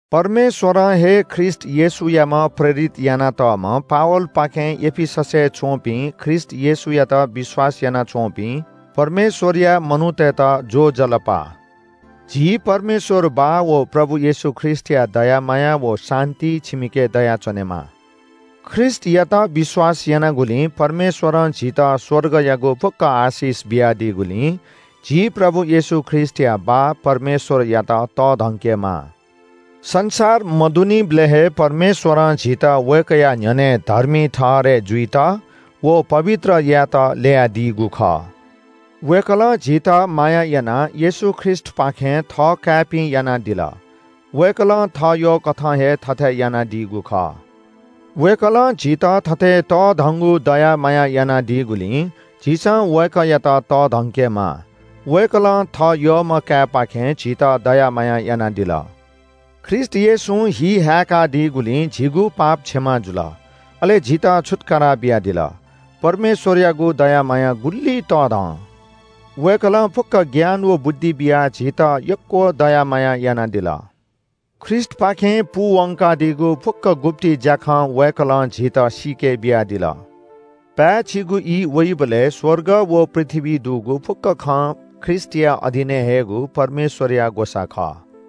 परमेश्‍वरं हे ख्रीष्‍ट येशूयाम्‍ह प्रेरित यानातःम्‍ह पावलपाखें एफिससय् च्‍वंपिं ख्रीष्‍ट येशूयात विश्‍वास यानाच्‍वंपिं परमेश्‍वरया मनूतय्‌त ज्‍वजलपा! झी परमेश्‍वर बाः व प्रभु येशू ख्रीष्‍टया दया माया व शान्‍ति छिमिके दयाच्‍वनेमा। ख्रीष्‍टयात विश्‍वास यानागुलिं परमेश्‍वरं झीत स्‍वर्गयागु फुक्‍क आशिष बियादीगुलिं झी प्रभु येशू ख्रीष्‍टया बाः परमेश्‍वरयात तःधंकेमाः। संसार मदुनिबलय् हे परमेश्‍वरं झीत वय्‌कःया न्‍ह्यःने धर्मी ठहरय् जुइत व पवित्र यायेत ल्‍ययादीगु खः। वय्‌कलं झीत माया यानाः येशू ख्रीष्‍टपाखें थःकाय्‌पिं यानादिल। वय्‌कलं थः यःकथं हे थथे यानादीगु खः। वय्‌कलं झीत थथे तःधंगु दया माया यानादीगुलिं झीसं वय्‌कःयात तःधंकेमाः। वय्‌कलं थः यःम्‍ह काय्‌पाखें झीत दया माया यानादिल। ख्रीष्‍ट येशूं हि हाय्‌कादीगुलिं झीगु पाप क्षमा जुल। अले झीत छुत्‍कारा बियादिल। परमेश्‍वरयागु दया माया गुलि तःधं! वय्‌कलं फुक्‍क ज्ञान व बुद्धि बियाः झीत यक्‍व दया माया यानादिल। ख्रीष्‍टपाखें पूवंकादीगु फुक्‍क गुप्‍ति ज्‍याखँ वय्‌कलं झीत सीके बियादिल। पाय्‌छिगु ई वइबलय् स्‍वर्ग व पृथ्‍वीइ दुगु फुक्‍क खँ ख्रीष्‍टया अधीनय् हयेगु परमेश्‍वरया ग्‍वसाः खः।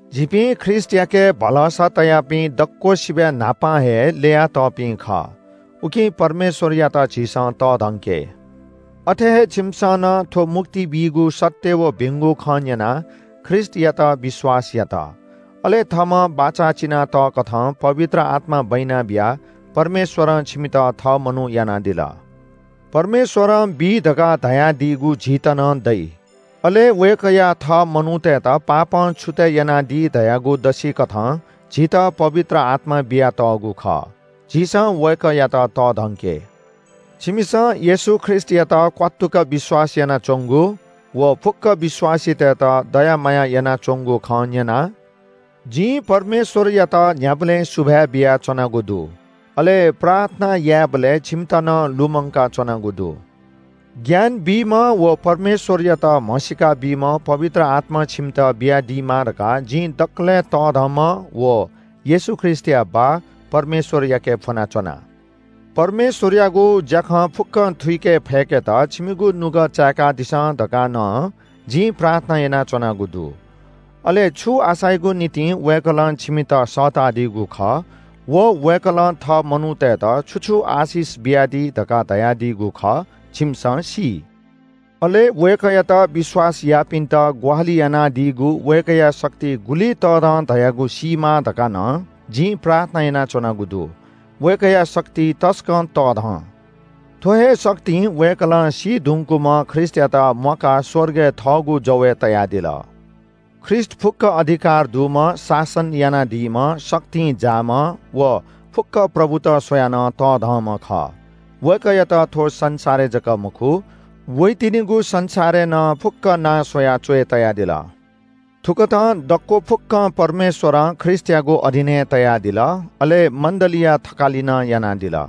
झीपिं ख्रीष्‍टयाके भरोसा तयापिं दक्‍वसिबय् न्‍हापां हे ल्‍ययातःपिं खः। उकिं परमेश्‍वरयात झीसं तःधंके। अथे हे छिमिसं नं थ्‍व मुक्ति बीगु सत्‍य व भिंगु खँ न्‍यनाः ख्रीष्‍टयात विश्‍वास यात। अले थःम्‍हं बाचा चिना तःकथं पवित्र आत्‍मा बैना बियाः परमेश्‍वरं छिमित थः मनू यानादिल। परमेश्‍वरं बी धकाः धयादीगु झीत नं दइ, अले वय्‌कःया थः मनूतय्‌त पापं छुतय् यानादी धयागु दसिकथं झीत पवित्र आत्‍मा बियातःगु खः। झीसं वय्‌कःयात तःधंके। छिमिसं येशू ख्रीष्‍टयात क्‍वात्तुक विश्‍वास यानाच्‍वंगु व फुक्‍क विश्‍वासीतय्‌त दया माया यानाच्‍वंगु खँ न्‍यनाः जिं परमेश्‍वरयात न्‍ह्याबलें सुभाय् बियाच्‍वनागु दु। अले प्रार्थना यायेबलय् छिमित नं लुमंकाच्‍वनागु दु। ज्ञान बीम्‍ह व परमेश्‍वरयात म्‍हसीका बीम्‍ह पवित्र आत्‍मा छिमित बियादीमा धकाः जिं दकलय् तःधंम्‍ह व येशू ख्रीष्‍टया बाः परमेश्‍वरयाके फ्‍वनाच्‍वना। परमेश्‍वरयागु ज्‍याखँ फुक्‍कं थुइके फय्‌केत छिमिगु नुगः चाय्‌कादिसँ धकाः नं जिं प्रार्थना यानाच्‍वनागु दु। अले छु आशायागु निंतिं वय्‌कलं छिमित सःतादीगु खः व वय्‌कलं थः मनूतय्‌त छु छु आशिष बियादी धकाः धयादीगु खः, छिमिसं सी। अले वय्‌कःयात विश्‍वास याःपिन्‍त ग्‍वाहालि यानादीगु वय्‌कःया शक्ति गुलि तःधं धयागु सीमा धकाः नं जिं प्रार्थना यानाच्‍वनागु दु। वय्‌कःया शक्ति तसकं तःधं। थ्‍व हे शक्तिं वय्‌कलं सी धुंकूम्‍ह ख्रीष्‍टयात म्‍वाकाः स्‍वर्गय् थःगु जवय् तयादिल। ख्रीष्‍ट फुक्‍क अधिकार दुम्‍ह, शासन यानादीम्‍ह, शक्तिं जाःम्‍ह व फुक्‍क प्रभुत स्‍वयाः नं तःधंम्‍ह खः। वय्‌कःयात थ्‍व संसारय् जक मखु, वइतिनिगु संसारय् नं फुक्‍क नां स्‍वयाः च्‍वय् तयादिल। थुकथं दक्‍व फुक्‍कं परमेश्‍वरं ख्रीष्‍टयागु अधीनय् तयादिल। अले मण्‍डलीया थकालि नं यानादिल।